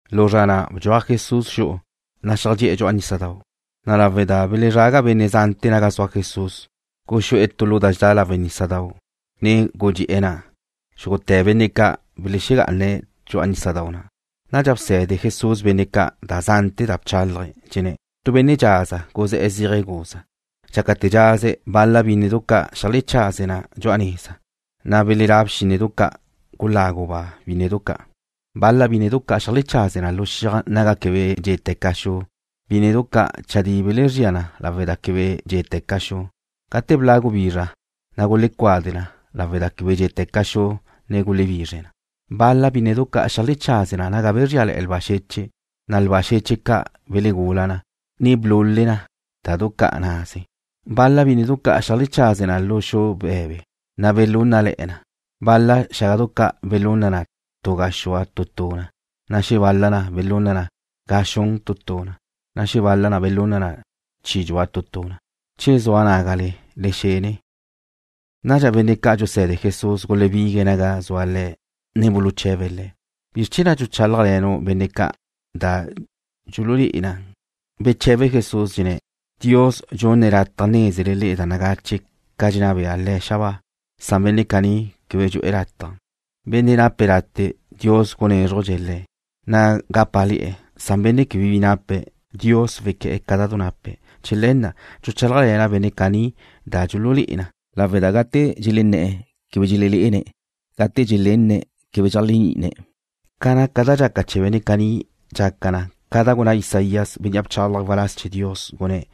Lu zra na' bdxuaj Jesús xu'u, na' xeajdxé'e̱ dxu'a nísadau'. Na' lawe' da belezraga benne' zante̱ naga zua Jesús, guxú'e̱ tu lu da dxedá lawe' nísadau', ne gudxé'e̱ na'. Xúgute̱ benne' ca' belexegá'ane̱' dxu'a nísadau' na'. Nadxa bse̱de Jesús benne' ca' da zante̱ da bchálaje̱', dxenné̱': ―Tu benne' dxaza guzé̱'e̱ zíaje̱' guza. Dxácate̱ dxaze̱', bal-la bínnedu ca' xeajlechaze na dxu'a neza. Na' belelá' bxínnedu ca', guláguba' bínnedu ca'. Bal-la bínnedu ca' xeajlechaze na lu xiaj naga quebe dxé'teca xu. Bínnedu caní chadí gulezría na lawe' da quebe dxé'teca xu. Gate bla' gubizra, na' gulecuade na. Lawe' da quebe dxé'teca xu, na' gulebizre na. Bal-la bínnedu ca' xeajlechaze na naga bezríale̱'e̱ lba xeche', na' lba xeche' ca' belegula na, ne blule na da du ca' naze̱'. Bal-la bínnedu ca' xeajlechaze na lu xu be̱be, na' belúnnale̱'e̱ na. Bal-la xágadu ca' belunna na tu gaxúa tu tu na, na' xebal-la na belunna na ga xun tu tu na, na' xebal-la na belunna na chi dxua tu tu na. Che zua nágale, le xene. Nadxa benne' ca' dxuse̱de Jesús gulebigue̱' naga zue̱' Le̱', ne buluche̱be̱' Le̱': ―¿Bizr chee̱ na' dxuchálajle̱nu' benne' ca' da dxululé'e na? Beche̱be Jesús, dxenné̱': ―Dios dxunne̱' lataj nézele le'e da nagache ca dxenná bea Le̱' xabáa, san benne' caní quebe dxu'e̱ lataj. Benne' nape̱' late', Dios gunézrujdxe̱' le̱', na' gápale̱'e̱, san benne' quebe bi nape̱', Dios wequé̱'e̱ ca da du nape̱'. Chee̱ le̱ na' dxuchálajle̱na' benne' caní da dxululé'e na, lawe' da cate' dxelenné̱'e̱ quebe dxelelé'ene̱'. Cate' dxelenne̱' quebe dxeléajni'ine̱'. Ca naca da dxaca chee̱ benne' caní dxaca na ca gunná Isaías, bénnea' bchálaje̱' waláz chee̱ Dios, gunné̱':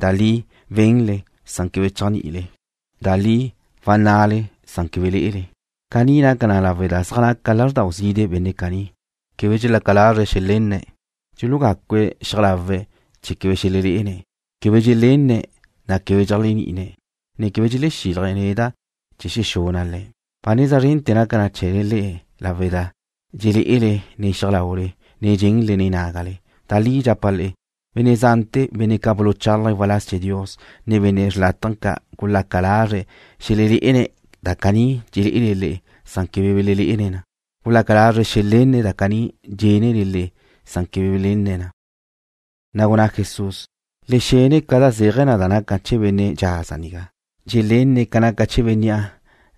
Da li wenle. Cate' dxenle quebe dxéajni'ile. Da li wanná'le. Cate' dxenna'le quebe dxelé'ele. Caní naca na lawe' da zaj naca lázrdau zide' benne' caní. Quebe dxelaca lazre̱' xelenne̱'. Dxulugácue̱' xiaj lawe̱' chee̱ quebe xelelé'ene̱'. Quebe dxelenne̱', na' quebe dxeléajni'ine̱'. Quebe dxelexílaje̱' neda' chee̱ xexuna' le̱'. ’Ba neza zrente̱ naca na chee̱le le'e lawe' da dxelé'ele nen xiaj laule, ne dxenle nen nágale. Da li dxapa' le'e, benne' zante̱, benne' ca' buluchálaje̱' waláz chee̱ Dios, ne benne' xrlátaje ca' gulaca lazre̱' xelelé'ene̱' da caní dxelé'ele le'e. Quebe belelé'ene̱' na. Gulaca lazre̱' xelenne̱' da caní dxénnele le'e. Quebe belenne̱' na. Na' gunná Jesús: ―Le xenne ca zéaje̱ da naca chee̱ benne' dxaza nigá. Benne' dxelenne̱' ca naca chee̱ Bénnea'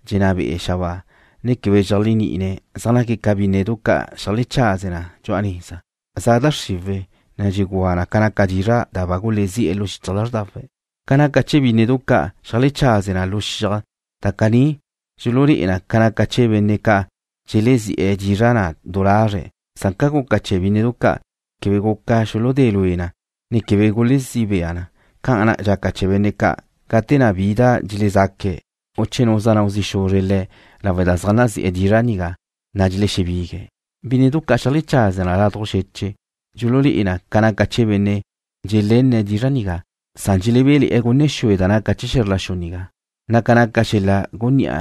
dxenná be'e̱ xabáa, ne quebe dxeléajni'ine̱' zaj naque̱' ca bínnedu ca' xeajlechaze na dxu'a neza. Za da xriwe̱' ne dxugúa na ca naca dizra' da ba gulezí'e̱ lu xichaj lázrdawe̱'. Ca naca chee̱ bínnedu ca' xeajlechaze na lu xiaj, da caní dxululé'e na ca naca chee̱ benne' ca' dxelezi'e̱ dizra' na' du lazre̱'. Ca na' guca chee̱ bínnedu ca', quebe guca xuludé lue na, ne quebe guzí bea na, ca'an dxaca chee̱ benne' caní, gate na' bi da dxelezaque̱', u che nu zeajnáu zi' xuzre̱' le̱' lawe' da zaj nazi'e̱ dizra' nigá, na' dxelexebigue̱'. Bínnedu ca' xeajlechaze na ládujla xeche' dxululé'e na ca naca chee̱ benne' dxelenne̱' dizra' nigá, san dxelebé'le̱'e̱ gunne xue da naca chee̱ xe̱zr la xu nigá, na' ca naca xel-la' gunní'a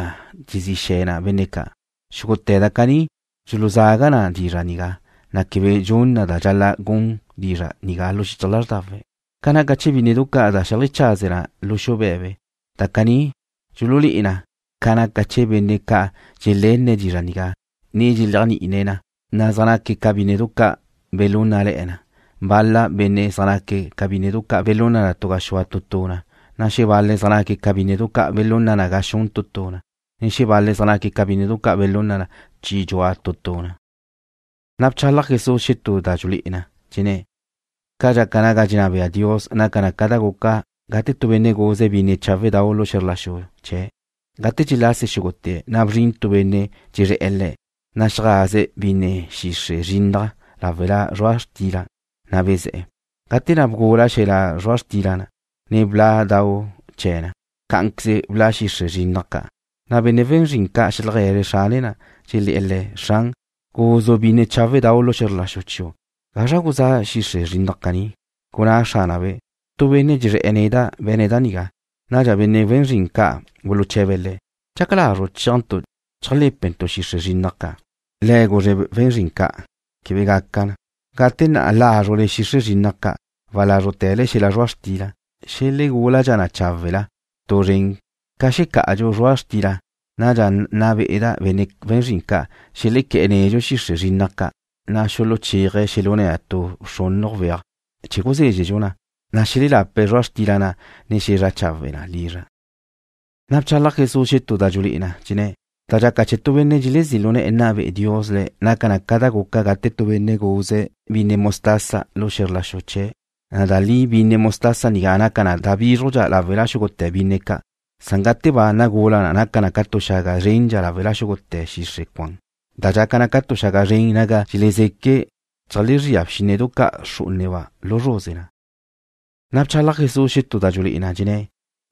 dxezí xe̱ na benne' ca'. Xúgute̱ da caní dxuluzaga na dizra' nigá, na' quebe dxun na da dxal-la' gun dizra' nigá lu xichaj lázrdawe̱'. Ca naca chee̱ bínnedu ca' da xeajlechaze na lu xu be̱be, da caní dxululé'e na ca naca chee̱ benne' ca' dxelenne̱' dizra' nigá, ne dxeléajni'ine̱' na, na' zaj naque̱' ca bínnedu ca' belúnnale̱'e̱ na. Bal-la benne' zaj naque̱' ca bínnedu ca' belunna na tu gaxúa tu tu na, na' xebal-le̱' zaj naque̱' ca bínnedu ca' belunna na ga xun tu tu na, na' xebal-le̱' zaj naque̱' ca bínnedu ca' belunna na chi dxua tu tu na. Nadxa bchalaj Jesús xetú da dxulé'e na, dxenné̱': ―Ca dxaca ga ni dxenná bea Dios naca na ca da guca gate tu benne' guze̱' binne cháwe'dau' lu xe̱zr la xu chee̱'. Gate dxelase xúgute̱', na' bzrin tu benne' dxezré̱'e̱ le̱', ne xeajaze̱' binne xixre' zrinnaj láwela zrua' xtila, na' bezé̱'e̱. Gate na' bgula xel-la' zrua' xtila, ne bla' dau chee̱ na, cá'anqueze bla' xixre' zrinnaj ca'. Nadxa benne' we̱n zrin ca' xeajlegue̱zre̱' xrane na, dxelé̱'e̱ le̱': “Xran, guzu' binne cháwe'dau' lu xe̱zr la xu chiu'. ¿Gazra guzá xixre' zrinnaj caní?” Gunná xránabe': “Tu benne' dxezré̱'e̱ neda' be̱ne̱' da nigá.” Nadxa benne' we̱n zrin ca' buluche̱be̱' le̱': “¿Dxaca lazru' chéajntu' cheajlé̱pentu' xixre' zrinnaj ca'?” Le̱' guzre̱' we̱n zrin ca': “Quebe gaca na. Gate na' lázrule xixre' zrinnaj ca', walázrute̱le xel-la' zrua' xtila. Xelegúladxa na cháwe'la tu zren ca xecá'adxadxu zrua' xtila. Nadxa nna be'eda' benne' we̱n zrin ca' xelequé̱'e̱ nedxu xixre' zrinnaj ca', na' xuluchéaje̱' xelune̱' tu xrúnujdu weaj chee̱ guzézxedxu na. Nadxa xelelape̱' zrua' xtila na', ne xezrá chawe' na lizra'.” Nadxa bchalaj Jesús xetú da dxulé'e na, dxenné̱': ―Da dxaca chee̱ benne' dxelezí' lu ne̱'e̱ nna be'e Dios le̱' naca na ca da guca gate tu benne' guze̱' binne mostaza lu xe̱zr la xu chee̱'. Da li binne mostaza nigá naca na da bízrujdxa lawe' xúgute̱ binne ca'. Gate ba nagula na naca na tu xaga zrendxa lawe' xúgute̱ xixre' cuan. Dxaca na ca tu xaga zren naga dxelezeque' cheajlezría bxínnedu ca' xrú'uneba' lu zruze na. Nadxa bchalaj Jesús xetú da dxulé'e na, dxenné̱':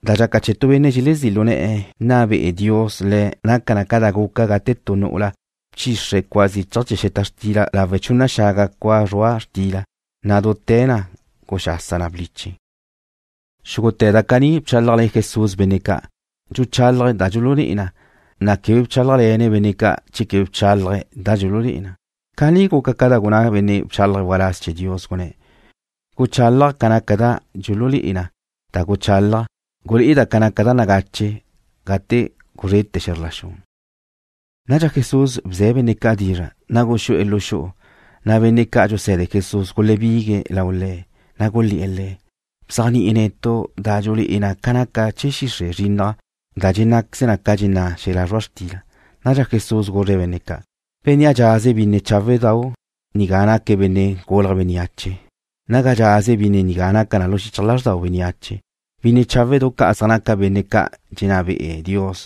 ―Da dxaca chee̱ benne' dxelezí' lu ne̱'e̱ nna be'e Dios le̱' naca na ca da guca gate tu nu'ula bchixre cua zichaj chee̱ xeta xtila lawe' chunna xaga cua zrua' xtila, na' dute̱ na guxasa na bliche. Xúgute̱ da caní bchálajle̱ Jesús benne' ca', dxuchálaje̱' da dxululé'e na, na' quebe bchálajle̱ne̱' benne' ca' che quebe bchálaje̱' da dxululé'e na. Caní guca ca da gunná benne' bchálaje̱' waláz chee̱ Dios, gunné̱': Guchálaja' ca naca da dxulé'e na da guchálaja'. Gulé'eda' ca naca da nagache gate guzrete̱ xe̱zr la xu. Nadxa Jesús bze̱' benne' ca' dizra', na' guxú'e̱ lu xu'u. Benne' ca' dxuse̱de Jesús gulebigue̱' lau Le̱', na' gulé̱'e̱ Le̱': ―Bzéajni'i netu' da dxulé'e na ca naca chee̱ xixre' zrinnaj da dxenná'queze na ca dxenná' xel-la' zrua' xtila. Nadxa Jesús guzre̱' benne' ca': ―Bénnea' dxaze̱' binne cháwe'dau' nigá naque̱' Benne' Gulje̱' Bénneache. Naga dxaze̱' binne nigá naca na lu xichaj lázrdau bénneache. Binne cháwe'du ca' zaj naca benne' ca' dxenná be'e Dios,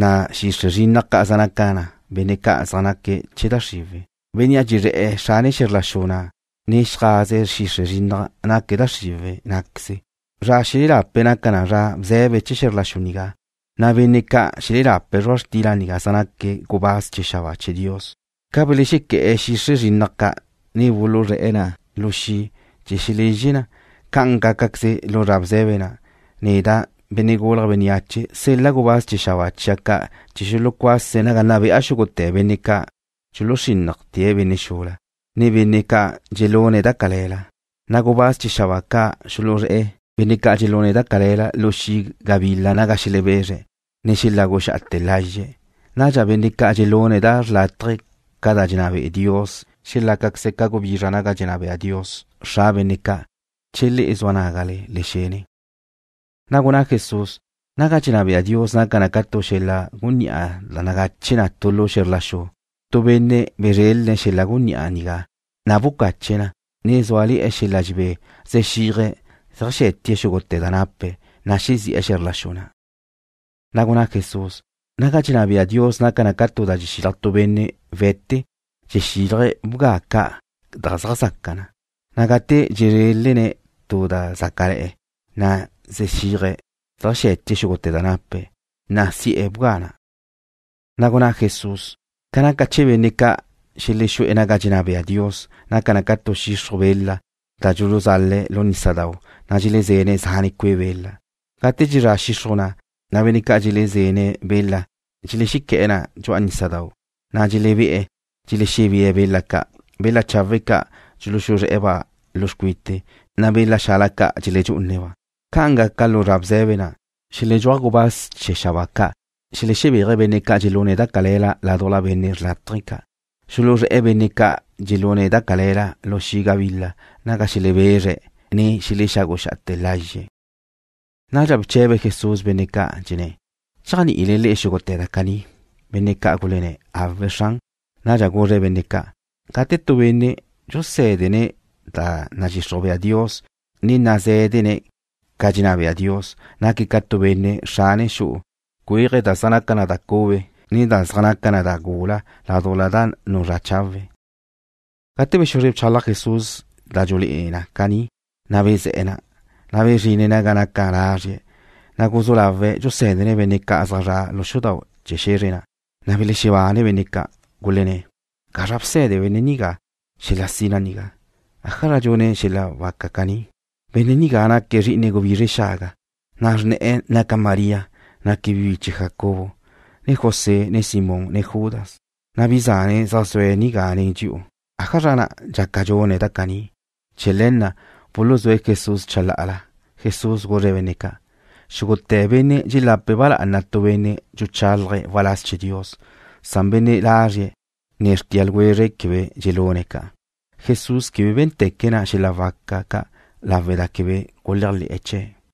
na' xixre' zrinnaj ca' zaj naca na benne' ca' zaj naque̱' chee̱ da xriwe̱'. Bénnea' dxezré̱'e̱ xrane xe̱zr la xu na', ne xeajaze̱' xixre' zrinnaj naque̱' da xriwe̱' ná'queze. Zra xelelape̱' naca na zra bze̱be chee̱ xe̱zr la xu nigá, na' benne' ca' xelelape̱' zrua' xtila na' zaj naque̱' gubáz chee̱ xabáa chee̱ Dios. Ca belexequé̱'e̱ xixre' zrinnaj ca', ne buluzré̱'e̱ na lu xi' chee̱ xelezxe na, ca'an gácaqueze lu zra bze̱be na'. Neda', Benne' Gulje̱' Bénneache, sel-la' gubáz chee̱ xabáa chia' ca' chee̱ xulucuase̱' naga nna be'a xúgute̱ benne' ca' dxuluxrínnajte̱' benne' xula, ne benne' ca' dxelune̱' da cale̱la. Nadxa gubáz chee̱ xabáa ca' xuluzré̱'e̱ benne' ca' dxelune̱' da cale̱la lu xi' gabila naga xelebezre̱', ne xeláguxa'ate̱ lazxe̱'. Nadxa benne' ca' dxelune̱' da xrlátaje ca da dxenná be'e Dios xelácaqueze̱' ca gubizra naga dxenná bea Dios, Xra benne' ca'. Che le'e zua nágale, le xene. Na' gunná Jesús: ―Naga dxenná bea Dios naca na ca tu xel-la' gunní'a da nagache na tu lu xe̱zr la xu. Tu benne' bezrélene̱' xel-la' gunní'a nigá, na' bucache̱' na. Ne zúale̱'e̱ xel-la' dxebé zexíaje̱' xeajxé̱tie̱' xúgute̱ da nape̱', na' bezi'e̱ xe̱zr la xu na'. Na' gunná Jesús: ―Naga dxenná bea Dios naca na ca tu da dxexilaj tu benne' we̱te, dxexílaje̱' bga ca' da zaj zaca na. Gate dxezrélene̱' tu da zácale̱'e̱, na' zexíaje̱' zeajxé̱tie̱' xúgute̱ da nape̱', na' si'e̱ bga na'. Na' gunná Jesús: ―Ca naca chee̱ benne' ca' xelexú'e̱ naga dxenná bea Dios, naca na ca tu xixruj bela, da dxuluzale̱' lu nísadau', na' dxelezene̱' zane' cue' bela. Gate dxezrá xixruj na', na' benne' ca' dxelezene̱' bela dxelexequé̱'e̱ na dxu'a nísadau', na' dxelebé'e̱ dxelexebée̱' bela ca'. Bela chawe' ca' dxuluxuzré̱'e̱-ba' lu xcuite, na' bela xala ca' dxeledxú'une̱'-ba'. Ca'an gaca lu zra bze̱be na'. Xeledxúaj gubáz chee̱ xabáa ca', xelexebéaje̱' benne' ca' dxelune̱' da cale̱la ládujla benne' xrlátaje ca'. Xuluzré̱'e̱ benne' ca' dxelune̱' da cale̱la lu xi' gabila, naga xelebezre̱', ne xeláguxa'ate̱ lazxe̱'. Nadxa bche̱be Jesús benne' ca', dxenné̱': ―¿Dxéajni'ile le'e xúgute̱ da caní? Benne' ca' gulenné̱': ―Awe', Xran. Nadxa guzre̱' benne' ca': ―Gate tu benne' dxusé̱dene̱' da nadxixruj bea Dios, ne nazé̱dene̱' ca dxenná bea Dios, naque̱' ca tu benne' xrane xu'u nézene̱' cuéaje̱' da zaj naca na da cube, ne da zaj naca na da gula ládujla da nuzrá chawe̱'. Gate bexuzre bchalaj Jesús da dxulé'e na caní, na' bezé̱'e̱ na'. Bezrine̱' naga naca lazrie̱'. Na' guzú lawe̱' dxusé̱dene̱' benne' ca' zaj zre̱'e̱ lu xudau' chee̱ xe̱zre na', na' belexebanne benne' ca', gulenné̱': ―¿Gazra bse̱de benne' nigá xel-la' sina nigá? ¿Ájazra dxune̱' xel-la' waca caní? Benne' nigá naque̱' zri'ine gubizre xaga, na' naca xrne̱'e̱ María. Naque̱' bi biche Jacobo, ne José, ne Simón, ne Judas. Bi zane̱' zaj zue̱' nigá nen dxi'u. ¿Ájazra na' dxaca dxune̱' da caní? Chee̱ le̱ na' buluzúe̱' Jesús chalá'ala. Jesús guzre̱' benne' ca': ―Xúgute̱ benne' xula dxelape̱' ba lá'ana tu benne' dxuchálaje̱' waláz chee̱ Dios. Benne' lazrie̱', ne xrtia ljwezre̱' quebe dxelúne̱' ca'. Jesús quebe bé̱nteque̱' na' xel-la' waca ca' lawe' da quebe guléajle̱'e̱ chee̱'.